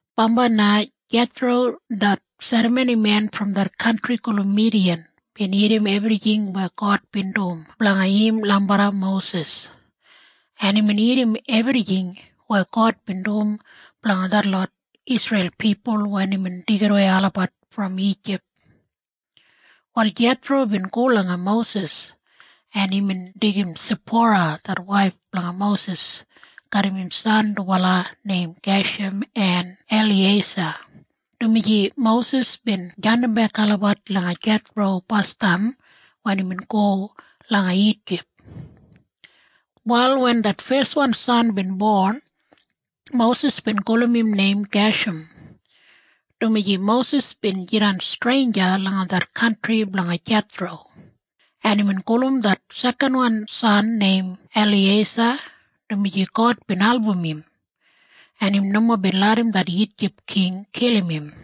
Bambai na Jethro det serramonimen brom det kantri gulum Midiyan bin irrim ebrijing weya God bin dum blanga im lambarra Mosis, en imbin irrim ebrijing weya God bin dum blanga detlot Isreil pipul wen imbin deigidawei olabat brom Ijip. Wal Jethro bin go langa Mosis, en imbin deigim Sipora det waif blanga Mosis garram im san dubala neim Gesham en Eliyeisa, dumaji Mosis bin jandimbek olabat langa Jethro basdam wen imbin go langa Ijip. Wal wen det feswan san bin bon, Mosis bin gulum im neim Gesham, dumaji Mosis bin jidan streinja langa det kantri blanga Jethro. En imbin gulum det sekanwan san neim Eliyeisa, dumaji God bin album im, en im nomo bin larram det Ijip king kilim im.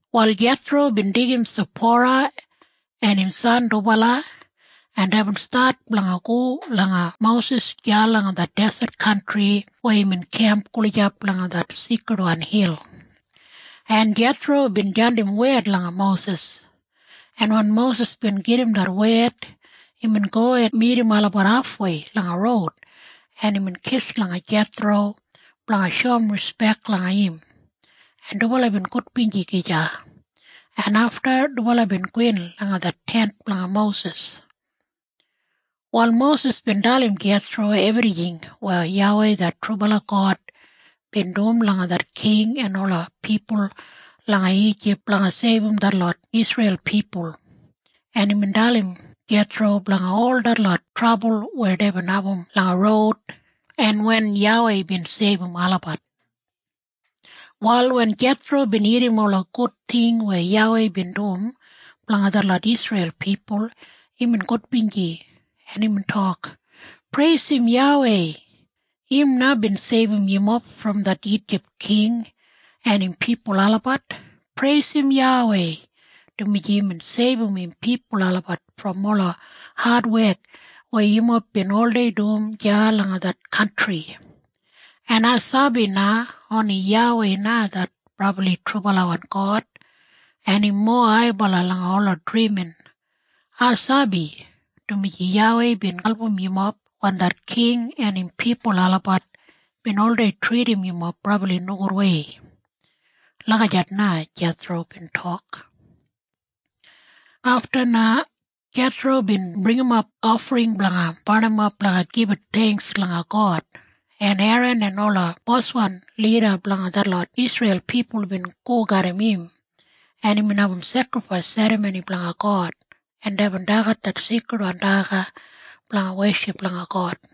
Wal Jethro bin deigim Sipora en im san dubala, en deibin stat blanga go langa Mosis deya langa det deset kantri weya imbin kemp gulijap langa det seikridwan hil, en Jethro bin jandim wed langa Mosis, en wen Mosis bin gedim det wed, imbin go en midim olabat hafwei langa roud, en imbin kis langa Jethro blanga shoum rispek langa im, en dubala bin gudbinji gija, en afta dubala bin gowin langa det tent blanga Mosis. Wal Mosis bin dalim Jethro ebrijing weya YAWEI det trubala God bin dum langa det king en ola pipul langa Ijip blanga seibum detlot Isreil pipul, en imbin dalim Jethro blanga ol detlot trabul weya deibin abum langa roud en wen YAWEI bin seibum olabat. Wal wen Jethro bin irrim ola gud ting weya YAWEI bin dum blanga detlot Isreil pipul, imbin gudbinji, en imbin tok, “Preisim YAWEI. Im na bin seibum yumob brom det Ijip king en im pipul olabat! Preisim YAWEI, dumaji imbin seibum im pipul olabat brom ola adwek weya yumob bin oldei dum deya langa det kantri! En ai sabi na oni YAWEI na det brabli trubalawan God, en im mowa haibala langa ola drimin. Ai sabi, dumaji YAWEI bin album yumob wen det king en im pipul olabat bin oldei tridim yumob brabli nogudwei.” Lagijat na Jethro bin tok. Afta na Jethro bin bringimap ofring blanga barnimap blanga gibit theingks langa God, en Eran en ola boswan lida blanga detlot Isreil pipul bin go garram im, en imbin abum sekrifais serramoni blanga God, en deibin dagat det seikridwan daga blanga weship langa God.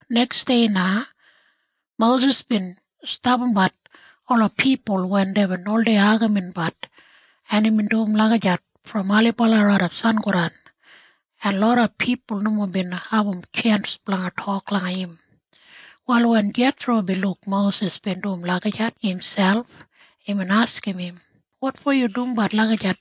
Neksdei na Mosis bin stapambat ola pipul wen deibin oldei agaminbat, en imbin dum lagijat brom ailibala raidap sangodan, en loda pipul nomo bin abum tjens blanga tok langa im. Wal wen Jethro bin luk Mosis bin dum lagijat imselp, imbin askim im, “Wotfo yu dumbat lagijat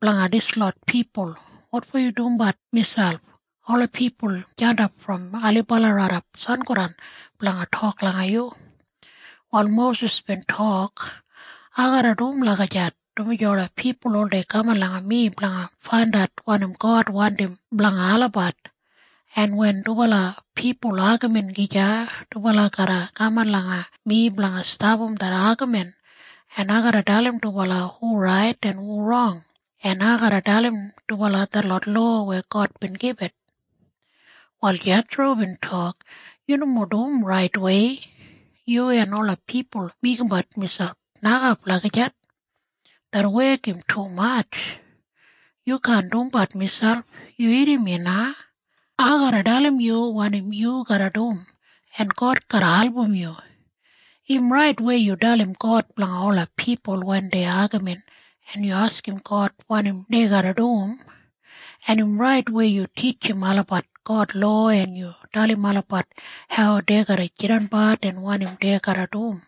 blanga dislot pipul? Wotfo yu dumbat miselp? Ola pipul jandap brom ailibala raidap sangodan blanga tok langa yu.” Wal Mosis bin tok, “Ai garra dum lagijat, dumaji ola pipul oldei kaman langa mi blanga faindat wanim God wandim blanga olabat. En wen dubala pipul agamin gija, dubala garra kaman langa mi blanga stapam det agamin, en ai garra dalim dubala hu rait en hu rong, en ai garra dalim dubala detlot lowa weya God bin gibit.” Wal Jethro bin tok, “Yu nomo dum raitwei. Yu en ola pipul meigimbat miselp nokap lagijat. Det wek im tumatj. Yu kaan dumbat miselp. Yu irrim mi na. Ai garra dalim yu wanim yu garra dum, en God garra album yu. Im rait weya yu dalim God blanga ola pipul wen dei agamin en yu askim God wanim dei garra dum, en im rait weya yu titjim olabat God lowa en yu dalim olabat hau dei garra jidanbat en wanim dei garra dum.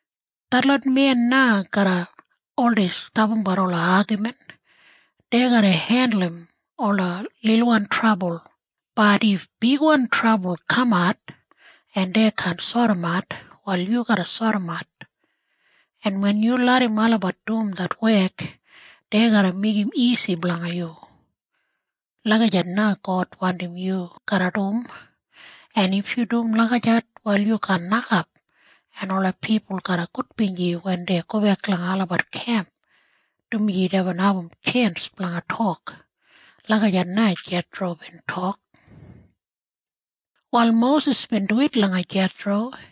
Detlot men na garra oldei stapambat ola agamin. Dei garra hendulum ola lilwan trabul. Bat if bigwan trabul kamat, en dei kaan sodimat, wal yu garra sodimat. En wen yu larram olabat dum det wek, dei garra meigim isi blanga yu. Lagijat na God wandim yu garra dum. En if yu dum lagijat, wal yu kaan nokap, en ola pipul garra gudbinji wen dei gobek langa olabat kemp, dumaji deibin abum tjens blanga tok.” Lagijat na Jethro bin tok. Wal Mosis bin duwit langa Jethro,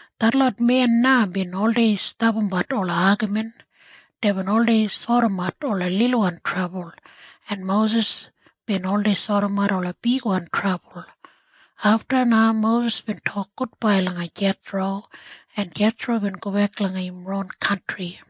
Detlot men na bin oldei stapambat ola agamin. Deibin oldei sodimat ola lilwan trabul, en Mosis bin oldei sodimat ola bigwan trabul. Afta na Mosis bin tok gudbai langa Jethro, en Jethro bin gobek langa im ron kantri.